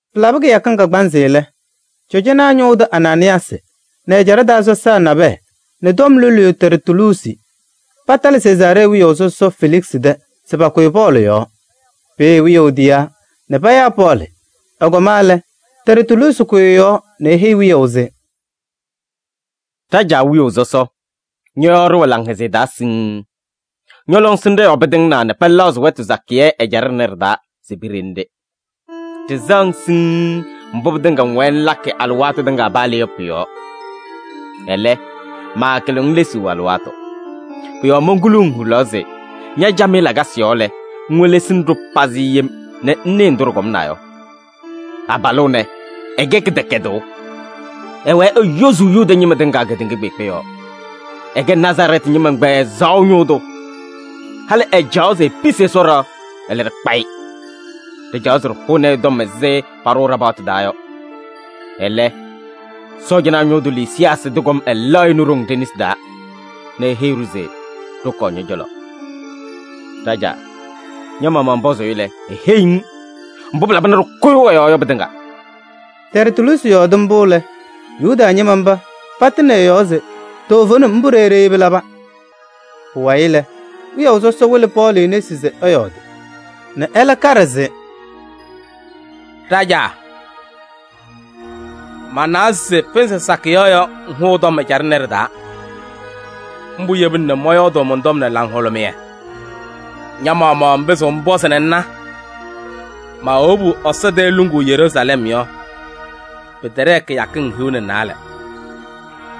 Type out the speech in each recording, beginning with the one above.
Pɩlabɩ kɩyakɩŋ kagbaanzɩ lɛ, cɔjɔnaa ñʋʋ tʋ Anaanɩyaasɩ nɛ ɛjaɖɛ taa sɔsaa nabɛyɛ nɛ tɔm loluyu Tɛrtuluusi patalɩ Sezaaree wiyaʋ sɔsɔ Feliksɩ tɛ se pakʋyɩ Pɔɔlɩ yɔɔ. Peeye wiyaʋ tiyaa nɛ payaa Pɔɔlɩ. Ɛkɔma lɛ, Tɛrtuluusi kʋyɩ ɛ-yɔɔ: eheyi wiyaʋ se: “Ɖajaa wiyaʋ sɔsɔ! Ñɔ-yɔɔ ɖɩwɛ laŋhɛzɩyɛ taa siŋŋ. Ñɔ-lɔŋsɩnɖɛ yɔɔ pɩtɩŋnaa nɛ pɛlɛɣzɩ wɛtʋ sakɩyɛ ɛjaɖɛ ɖɩnɛ ɖɩ-taa se piɖeni-ɖɩ. Ɖɩsɛɣ-ŋ siŋŋ mbʋ pɩtɩŋa ŋwɛɛ ŋlakɩ alɩwaatʋ tɩŋa paa le yɔ pʋ-yɔɔ. Ɛlɛ, maakɩlɩɣ-ŋ lesuu alɩwaatʋ. Pʋ-yɔɔ monkuluu-ŋ hulaɣ se ña-camɩyɛ lakasɩ yɔɔ lɛ, ŋwelesini-ɖʋ pazɩ yem nɛ ŋnɩɩ ndʋ ɖɩkɔmnaa yɔ. Abalʋ ɛnɛ, ɛkɛ kɩdɛkɛdʋʋ: ɛwɛɛ eyozuu Yuda ñɩma tɩŋa kedeŋa kpeekpe yɔɔ. Ɛkɛ Nazarɛɛtɩ ñɩma ɛgbɛyɛ ɛzaɣʋ ñʋʋ tʋ. Halɩ ɛcaɣaɣ se episi Ɛsɔ ɖɩɣa, ɛlɛ ɖɩkpa-ɩ. [Ɖɩcaɣaɣ se ɖɩhʋnɩ-ɩ tɔm ɛzɩ paɖʋʋ ɖa-paɣtʋ taa yɔ. Ɛlɛ, Sɔɔjanaa ñʋʋ tʋ Lisiyaasɩ tɩkɔm ɛlɛɣ-ɩ nɛ ɖoŋ ɖe-nesi taa nɛ eheyi-ɖʋ se ɖɩkɔɔ ñɔ-cɔlɔ.] Ɖajaa, ña-maɣmaɣ ŋpɔzʋʋ-ɩ lɛ, eheyiɣ-ŋ mbʋ pɩlaba nɛ ɖɩkʋyʋʋ ɛ-yɔɔ yɔ pɩtɩŋa.” Tɛrtuluusi yɔɔdɩ mbʋ lɛ, Yuda ñɩma mba patɩnɩ ɛ-yɔɔ se toovenim mbʋ ɖeyi ɖeyi pɩlaba. Pʋwayɩ lɛ, wiyaʋ sɔsɔ wɩlɩ Pɔɔlɩ nesi se ɛyɔɔdɩ nɛ ɛlɛ kaɖɩ se: “Ɖajaa, manawa se pɩnzɩ sakɩyɛ yɔ ŋhʋʋ tɔm ɛjaɖɛ ɖɩnɛ ɖɩ-taa. Mbʋ yebina nɛ mɔyɔɔdʋʋ mɔn-tɔm nɛ laŋhʋlʋmɩyɛ. Ña-maɣmaɣ ŋpɩzɩɣ ŋpɔzɩ nɛ ŋna, maawobu Ɛsɔ tɛɛ luŋuu Yeruusalɛm yɔ, pɩtɛɖɛɛ kɩyakɩŋ hiu nɛ naalɛ.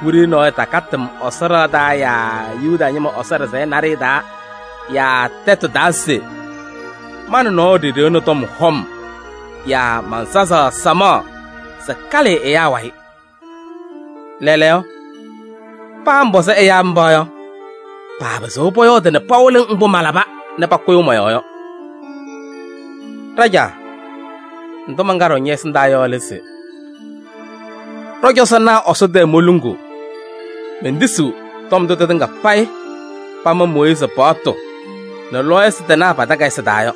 Wiɖiyi nɔɔyʋ takatɩ-m Ɛsɔ ɖɩɣa taa yaa Yuda ñɩma Ɛsɔ ɖɩsɛyɛ naɖɩyɛ taa yaa tɛtʋ taa se ma nɛ nɔɔyʋ ɖiɖiɣni tɔm hɔm yaa mansazaɣ samaɣ se kalɩɩ ɛyaa wayɩ. Lɛɛlɛɛyɔ, paa ŋpɔzɩ ɛyaa mba yɔ, paapɩzɩɣ pɔyɔɔdɩ nɛ pawɩlɩ-ŋ mbʋ malaba nɛ pakʋyʋʋ mɔ-yɔɔ yɔ. Ɖajaa, ndʋ mankaɖɩɣ ñɛ-ɛsɩndaa yɔ lɛ se: ɖɔ-cɔzɔnaa Ɛsɔ tɛɛ moluŋuu, mentisiɣ tɔm ndʋ tɩtɩŋa payɩ pama Mooyiizi paɣtʋ nɛ lɔɔyɩsɩ tɩnaa pa-takayɩsɩ taa yɔ.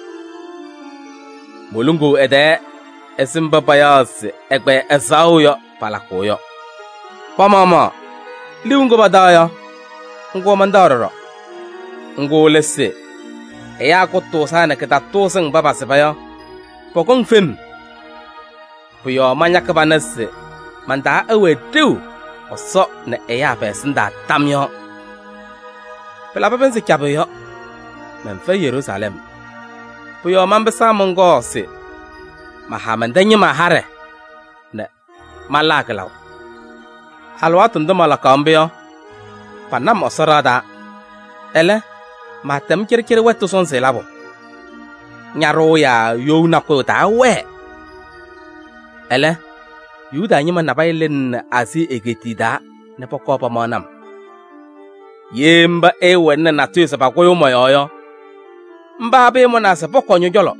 Moluŋuu ɛ-tɛɛ ɛzɩ mba payaɣ se ɛgbɛyɛ ɛzaɣʋ yɔ palakʋʋ yɔ. Pa-maɣmaɣ liu ŋgʋ pataɣ yɔ, ŋgʋ mantaɣ ɖɔɖɔ. Ŋgʋ lɛ se: ɛyaa kʋtʋʋzaa nɛ kɩtatʋʋzɩŋ mba pasɩba yɔ, pɔkɔŋ fem. Pʋ-yɔɔ mañakɩ pana se man-taa ɛwɛɛ ɖeu Ɛsɔ nɛ ɛyaa pɛ-ɛsɩndaa tam yɔɔ. Pɩlabɩ pɩnzɩ cabɩ yɔ, mɛnfɛyɩ Yeruusalɛm. Pʋ-yɔɔ manpɩsaa mɔnkɔɔ se maha mɛn-tɛ ñɩma haɖɛ nɛ malaa kɩlaʋ. Alɩwaatʋ ndʋ malakaɣ mbʋ yɔ, pana-m Ɛsɔ ɖɩɣa taa, ɛlɛ, maatɛm cɩɖɩcɩɖɩ wɛtʋ sɔnzɩ labʋ. Ñaɖʋʋ yaa you nakʋyʋ taawɛɛ. Ɛlɛ, Yuda ñɩma nabɛyɛ lɩnɩnɩ Aazii egeetiye taa nɛ pɔkɔɔ pamaɣnɩ-m. Ye mba ɛɛwɛnɩnɩ natʋyʋ se pakʋyʋʋ mɔ-yɔɔ yɔ, mba pɩɩmʋnaa se pɔkɔɔ ñɔ-cɔlɔ.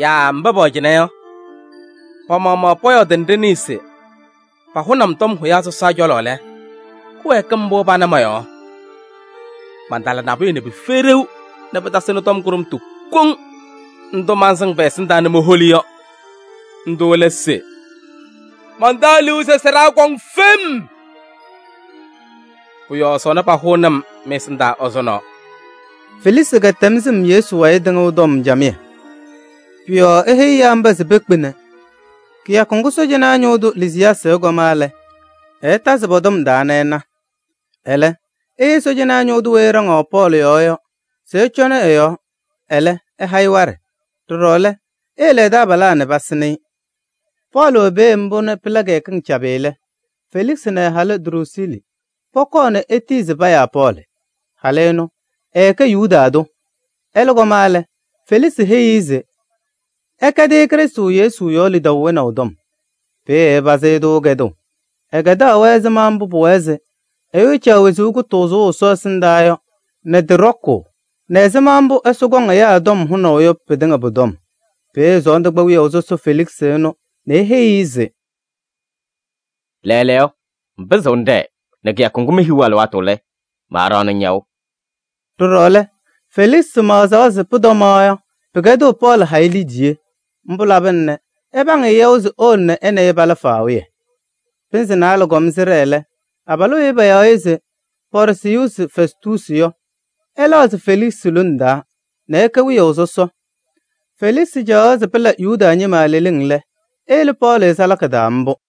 Yaa mba pɛwɛ cɩnɛ yɔ, pa-maɣmaɣ pɔyɔɔdɩ nɛ ɖɩnɩɩ se pahʋnɩ-m tɔm hʋyaa sɔsaa cɔlɔ lɛ, kɩwɛɛkɩm mbʋ pana mɔ-yɔɔ? Mantala nabʋyʋ nɛ pɩfɛyɩ ɖeu nɛ pɩtasɩnɩ tɔm kʋɖʋmtʋ kɔŋ ndʋ mansɩŋ pɛ-ɛsɩndaa nɛ moholi yɔ. Ndʋ lɛ se: ‘Mantaɣ liu se sɩɖaa kɔŋ fem. Pʋ-yɔɔ sɔnɔ pahʋʋnɩ-m mɩ-ɛsɩndaa ɛzʋnɔ.’” Feliksɩ kɛtɛm sɩm Yesu wayɩ tɩŋʋʋ tɔm camɩyɛ. Pʋ-yɔɔ eheyi ɛyaa mba se pekpe nɛ kɩyakʋ ŋgʋ sɔɔjanaa ñʋʋ tʋ Lisiyaasɩ ɛkɔma lɛ, ɛɛtazɩ pɔ-tɔm taa nɛ ɛna. Ɛlɛ eheyi sɔɔjanaa ñʋʋ tʋ weyi ɛɖaŋaɣ Pɔɔlɩ yɔɔ yɔ se ɛcɔnɩ ɛ-yɔɔ, ɛlɛ, ɛha-ɩ waɖɛ. Ɖɔɖɔ lɛ, eyele ɛ-taabalaa nɛ pasɩnɩ-ɩ. Pɔɔlɩ wɛ peeye mbʋ nɛ pɩla kɩyakɩŋ cabɩ lɛ, Feliksɩ nɛ ɛ-halʋ Druusiili pɔkɔɔ nɛ etiyi se payaa Pɔɔlɩ. Halʋ ɛnʋ ɛkɛ Yuda tʋ. Ɛlɛ kɔma lɛ, Feliksɩ heyi-i se ɛkɛdɩ-ɩ Krɩstʋ Yesu yɔɔ lidaʋ wɛnaʋ tɔm. Peeye ɛpazɩ-ɩ-tʋ kɛdʋʋ. Ɛkɛdaɣ-wɛ ɛzɩma mbʋ pʋwɛɛ se ɛyʋ ɛcaɣ wezuu kʋtʋʋzʋʋ Ɛsɔ ɛsɩndaa yɔ nɛ tɩ ɖɔkʋʋ nɛ ɛzɩma mbʋ Ɛsɔ kɔŋ ɛyaa tɔm hʋnaʋ yɔ pɩtɩŋa pʋ-tɔm. Peeye sɔɔndʋ kpa wiyaʋ sɔsɔ Feliksɩ ɛnʋ nɛ eheyi-i se: “Lɛɛlɛɛyɔ, ŋpɩzɩɣ ŋɖɛɛ nɛ kɩyakʋ ŋgʋ mehiɣ alɩwaatʋ lɛ, maaɖaɣnɩ-ŋ yaʋ.” Ɖɔɖɔ lɛ, Feliksɩ maɣzaɣ se pʋtɔmaɣ yɔ, pɩkɛdɩɣ Pɔɔlɩ ha-ɩ liidiye. Mbʋ labɩna nɛ ɛpaŋ-ɩ yaʋ se ewolo nɛ ɛ nɛ ɩ pala faawɩyɛ. Pɩnzɩ naalɛ kɔm sɩɖɛɛ lɛ, abalʋ weyi payaɣ se Pɔɔrsiyuusi Fɛstuusi yɔ, ɛlɛɣzɩ Feliksɩ lone taa nɛ ɛkɛ wiyaʋ sɔsɔ. Feliksɩ caɣaɣ se pɩla Yuda ñɩma leleŋ lɛ, eyele Pɔɔlɩ salaka taa mbʋ.